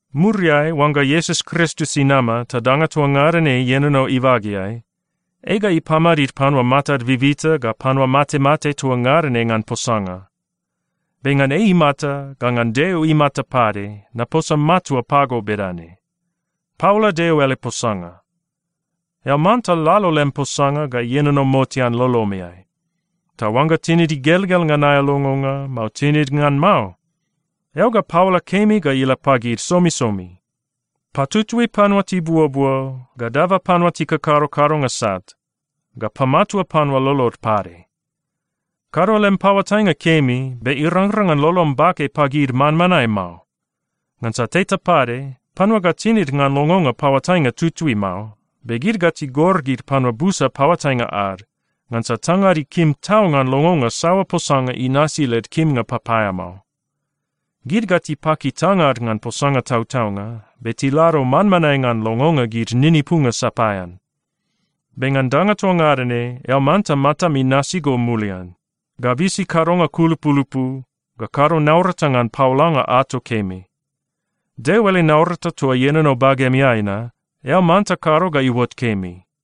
Muriai, oangga Iesus Kristus inama ta danga toa ngada ne ienono ibageai, ei ga ipamadid panua matad bibita ga panua matemate toa ngada ne ngan posanga. Be ngan ei imata ga ngan Deo imata pade, naposa matua pago bedane: Paola Deo ele posanga! Eao manta lalo lem posanga ga ienono motean lolomeai. Ta oangga tinid igelgel ngan aea longonga, mao tinid ngan mao, eao ga paola kemi ga ila pagid somisomi. Patutui panua tibuobuo, ga daba panua tikakado kadonga sat, ga pamatua panua lolod pade. Kado lem paoatainga kemi, be irangrang ngan lolom bake pagid manmanae mao. Ngansa teta pade, panua ga tinid ngan longonga paoatainga tutui mao, be gid ga tigor gid panua busa paoatainga ad, ngansa tangad ikim tau ngan longonga saoa posanga inasi led kimnga papaeamao. Gid ga tipaki tangad ngan posanga tautaunga, be tilado manmanae ngan longonga gid ninipunga sapaean. Be ngan danga toa ngada ne, eao manta matam inasi go mulian, ga bisi kadonga kulupulupu, ga kado naurata ngan paolanga ato kemi. Deo ele naurata toa ienono bagemeai na, eao manta kado ga iuot kemi.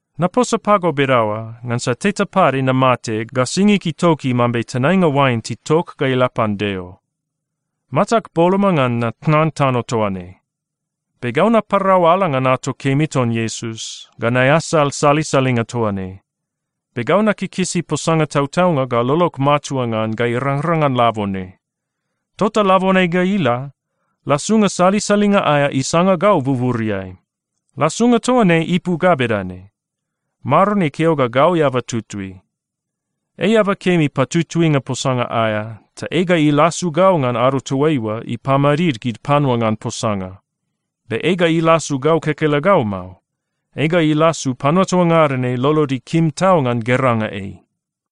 Naposa pago bedaoa ngansa teta pade namate ga singig itoki mambe tenainga oain titok ga ila pan Deo. Matag boloma ngan natnan tano toa ne. Be gau naparau ala ngan ato kemi ton Iesus, ga naeasal salisalinga toa ne, be gau nakikisi posanga tautaunga ga lolog matua ngan ga irangrang ngan labone. Tota labone ga ila, lasunga salisalinga aea isanga gau buburiai. Lasunga toa ne ipu ga bedane: Maron ikeo ga gau eaba tutui. Ei eaba kemi patutuinga posanga aea, ta ei ga ilasu gau ngan ado toaiua ipamadid gid panua ngan posanga. Be ei ga ilasu gau kekelegau mao, ei ga ilasu panua toa ngada ne lolod ikim tau ngan geranga ei.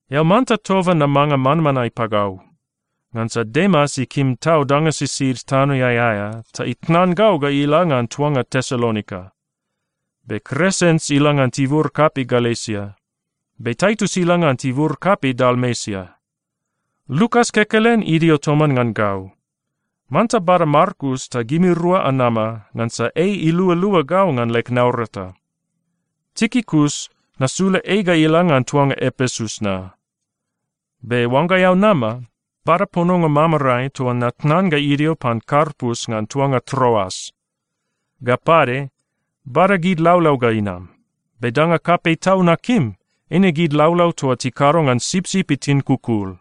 Eao manta toba namanga manmanae pagau. Ngansa Demas ikim tau danga sisid tanoeai aea, ta itnan gau ga ila ngan tuanga Tesalonika. Be Kresens ila ngan tibur kapei Galesia. Be Taitus ila ngan tibur kapei Dalmesia. Lukas kekelen idio toman ngan gau. Manta bada Markus ta gimirua anama, ngansa ei ilualua gau ngan leg naurata. Tikikus, nasula ei ga ila ngan tuanga Epesus na. Be oangga eao nama, bada pononga mamarae toa natnan ga idio pan Karpus ngan tuanga Troas. Ga pade, bada gid laulau ga inam. Be danga kapei tau nakim, eine gid laulau toa tikado ngan sipsip itin kukul.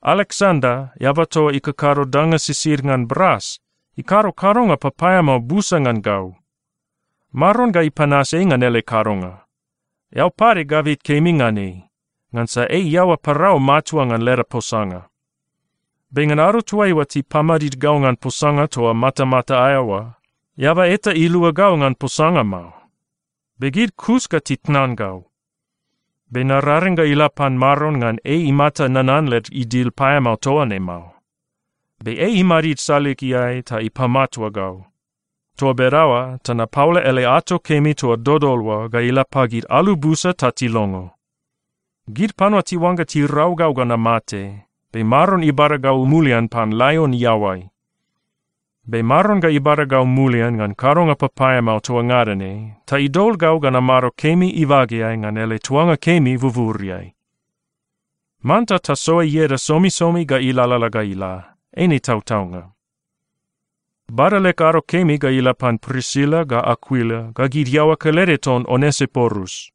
Aleksanda, eaba toa ikakado danga sisid ngan bras, ikado kadonga papaeamao busa ngan gau. Maron ga ipanas ei ngan ele kadonga. Eao pade gabit kemi ngan ei, ngansa ei iaoa parau matua ngan leda posanga. Be ngan ado toaiua tipamadid gau ngan posanga toa matamata aea oa, eaba eta ilua gau ngan posanga mao, be gid kus ga titnan gau. Be nararing ga ila pan Maron ngan ei imata nanan led idil paeamao toa ne mao. Be ei imadid saligeai ta ipamatua gau. Toa bedaoa ta napaola ele ato kemi toa dodol oa ga ila pagid alu busa ta tilongo. Gid panua tiuangga tirau gau ga namate, be Maron ibada gau mulian pan laion iaoai. Be Maron ga ibada gau mulian ngan kadonga papaeamao toa ngada ne ta idol gau ga namado kemi ibageai ngan ele tuanga kemi buburiai. Manta tasoa ieda somisomi ga ilalala ga ila. Eine tautaunga. Bada leg ado kemi ga ila pan Prisila ga Akuila ga gid iaoa kelede ton Onesiporus.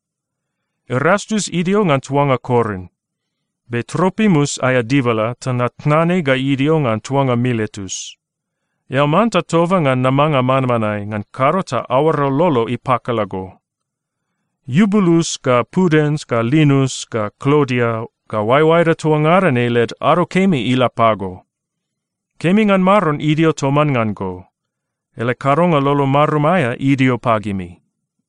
Erastus idio ngan tuanga Korin. Be Tropimus aea dibala, ta natnan ei ga idio ngan tuanga Miletus. Eao manta toba ngan namanga manmanae, ngan kado ta aoara lolo ipakala go. Iubulus ga Pudens ga Linus ga Klodia ga oaeoaeda toa ngada ne led ado kemi ila pago. Kemi ngan Maron idio toman ngan go. Ele kadonga lolo marum aea idio pagimi.